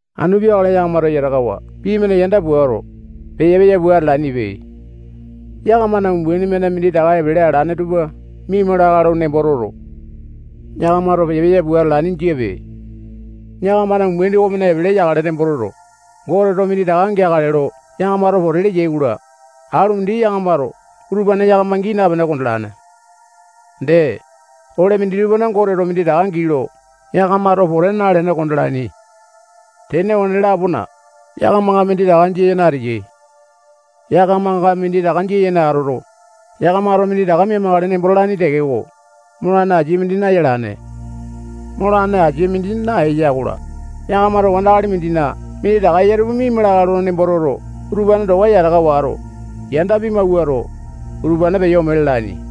Anu peakale yakamato yatakawa pii-mane yanda puato, peya-peya pua atalainipe. Yakamana umbaini-mane minditaka epele alane tupa miaima lakae lo nembo toto, yakamato peya-peya pua atalaini jiape. Yakamana umbaini okomane epele yakale nembo toto, Goteto minditaka geakale lo yakamato pote leyai-kola, alu mindi yakamato utupane yakama gii napene kondalane. Dee, ole mindi tupana Goteto minditaka gii lo yakamato pote nalene kondalaini. Tene okone-lapona, yakamanga minditaka jia yene ateyai. Yakamanga minditaka jia yene atoto, yakamato minditaka mia-makale nembo talaini tekeko, molane asia mindi nayalane. Molane asia mindi naeya-kola, yakamato wandakali mindina minditaka eya tupa miaima lakae lo nembo toto, utupane towa yataka wato, yanda pimawuato, utupane peyo ome lalaini.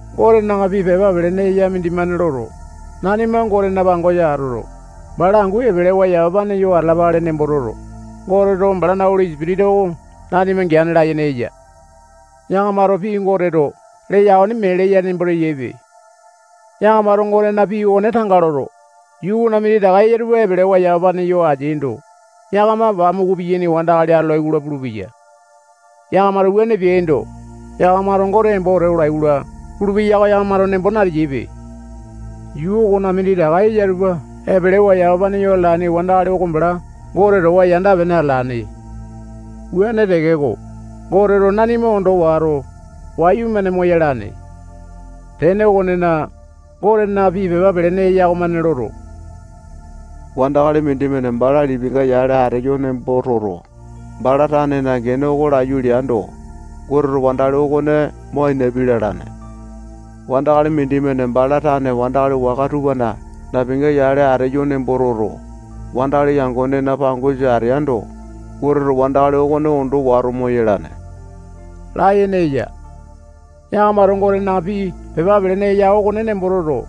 Gotena pii pepa pelene eya mindimane loto, nanima Gotena pangosa atoto, bala angu epelewa yamapane yo atalapale nembo toto, Goteto balana Oli Sipitisa oko nanima geane layene eya. Yakamato pii Goteto leya okone mee leya nembo teyaipe. Yakamato Gotena pii okone tanga loto, yuu okona minditaka eya tupa epelewa yamapane yo ateaindo, yakama pamuku piyaini wandakali atolai-kola pulupeya. Yakamato wuane peaindo, yakamato Gote embo wete olai-kola pulupeya oko yakamato nembo nateyaipe. Yuu okona minditaka eya tupa epelewa yamapane yo atalane wandakali oko bala Gote towa yanda-pene atalane. Wuane tekeko, Goteto nanima ondo wato, wayumane moyalane. Tene okonena, Gotena pii pepa pelene eya okomane loto, wandakali mindimane bala lipinga yale ateyo nembo toto, bala tanena gene oko laiyu leando, Goteto wandakali okone mo ainapi lalane. Wandakali mindimane bala tane wandakali waka tupana napinga yale ateyo nembo toto, wandakali yangonena pangosa ateando, Goteto wandakali okone ondo wato moyalane layene eya. Yakamato Gotena pii pepa pelene eya okone nembo toto,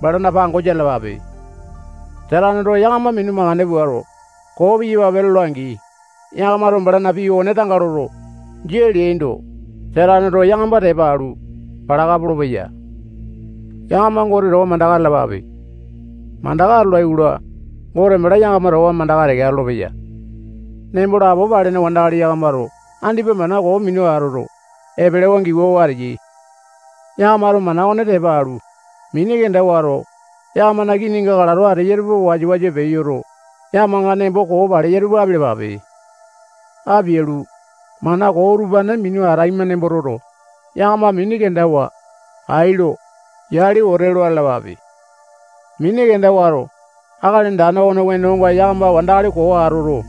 balana pangosa atalapape. Sataneto yakama minu makande puato, koo piyapapape lola-angi, yakamato balana pii okone tanga loto, jia leaindo, Sataneto yakama tepa alu, palaka polopeya. Yakama Gote towa mandaka atalapape. Mandaka atolai-kola, Gote bala yakama towa mandaka teke atolopeya. Nembo lapo palene wandakali yakamato andipa mana koo minu atoto, epelewa giwawa ateyai. Yakamato mana okone tepa alu, mini kenda wato, yakamana kininga kalato ateya tupa wasa-wasa peyoto, yakamanga nembo koo paleya tupa apialapape. Apialu, mana koo utupane minu ataima nembo toto, yakama mini kendawa, ai lo, yali wete lo atalapape. Mini kenda wato, Akali Andane okona wenonga yakama wandakali koo atoto,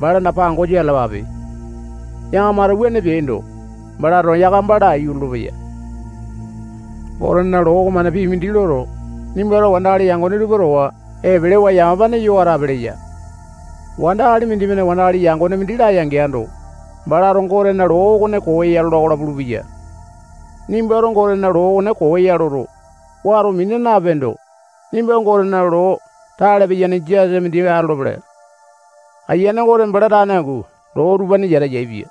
balana pangosa atalapape. Yakamato wuane peaindo, balato yakama laiyu lolopeya. Gotena loo okomane pii mindi loto, nimbato wandakali yangone tupa towa epelewa yamapane yo atape leya. Wandakali mindimane wandakali yangone mindi laya-geando, balato Gotena loo okone koo ya lola-kola pulupeya. Nimbato Gotena loo okone koo ya loto, wato mina napeendo, nimba Gotena loo tale piyane jasa mindi atolopele. Ayiane Gote bala tane angu loo utupane yata yaepia.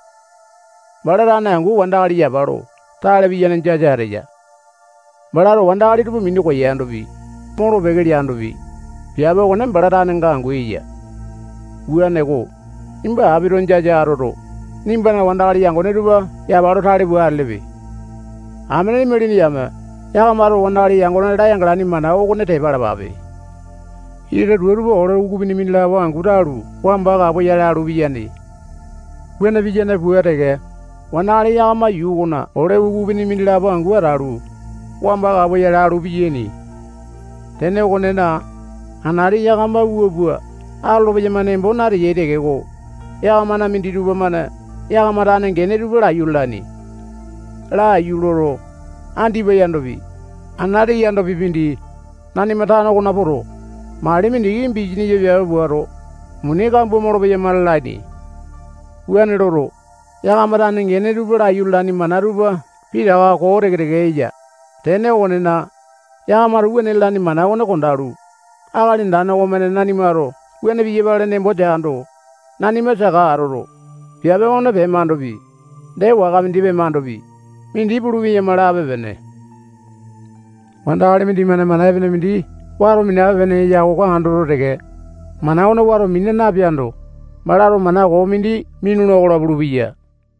Bala tane angu wandakali yapa lo tale piyane jasa ateya. Balato wandakali tupa minu koyandopi, molo-peke leandopi, piape okone bala tanenga angu eya. Wuaneko, nimba apito jasa atoto, nimbana wandakali yangone tupa yapa lo tale pua atelepe. Amene imalini yame yakamato wandakali yangone layanga-laini mana okone tepa alapape. Ita tua tupa ole ukupini mindilapo angu talu, wamba kapoyale alu piyane. Wuane piyane pua teke, wandakali yakama yuu okona ole ukupini mindilapo angu atalu, wamba kapoyale alu piyaini. Tene okonena, anati yakama wua pua atolo-peyama nembo nateyai tekeko, yakamana minditupa-mane yakama tane gene tupa laiyu lalaini. Laiyu loto, andipa yandopi, anati yandopi mindi, nanima tano okona poto, mali mindiki bisanisa piape puato, muni kambua molopeyama lalaini. Wuane loto, yakama tane gene tupa laiyu lalaini mana tupa pitaka koo teke-teke eya. Tene okonena, yakamato wuane lalaini mana okone kondalu, Akali Andane okomane nanimato wuane piyapale nembo teando, nanima saka atoto, piape okone pemandopi, dee waka mindi pemandopi, mindi pulu-peyama lape-pene. Wandakali mindimane mana epene mindi wato minape-pene eya oko andoto teke, mana okone wato mina napeando, balato mana koo mindi minula-kola pulupeya.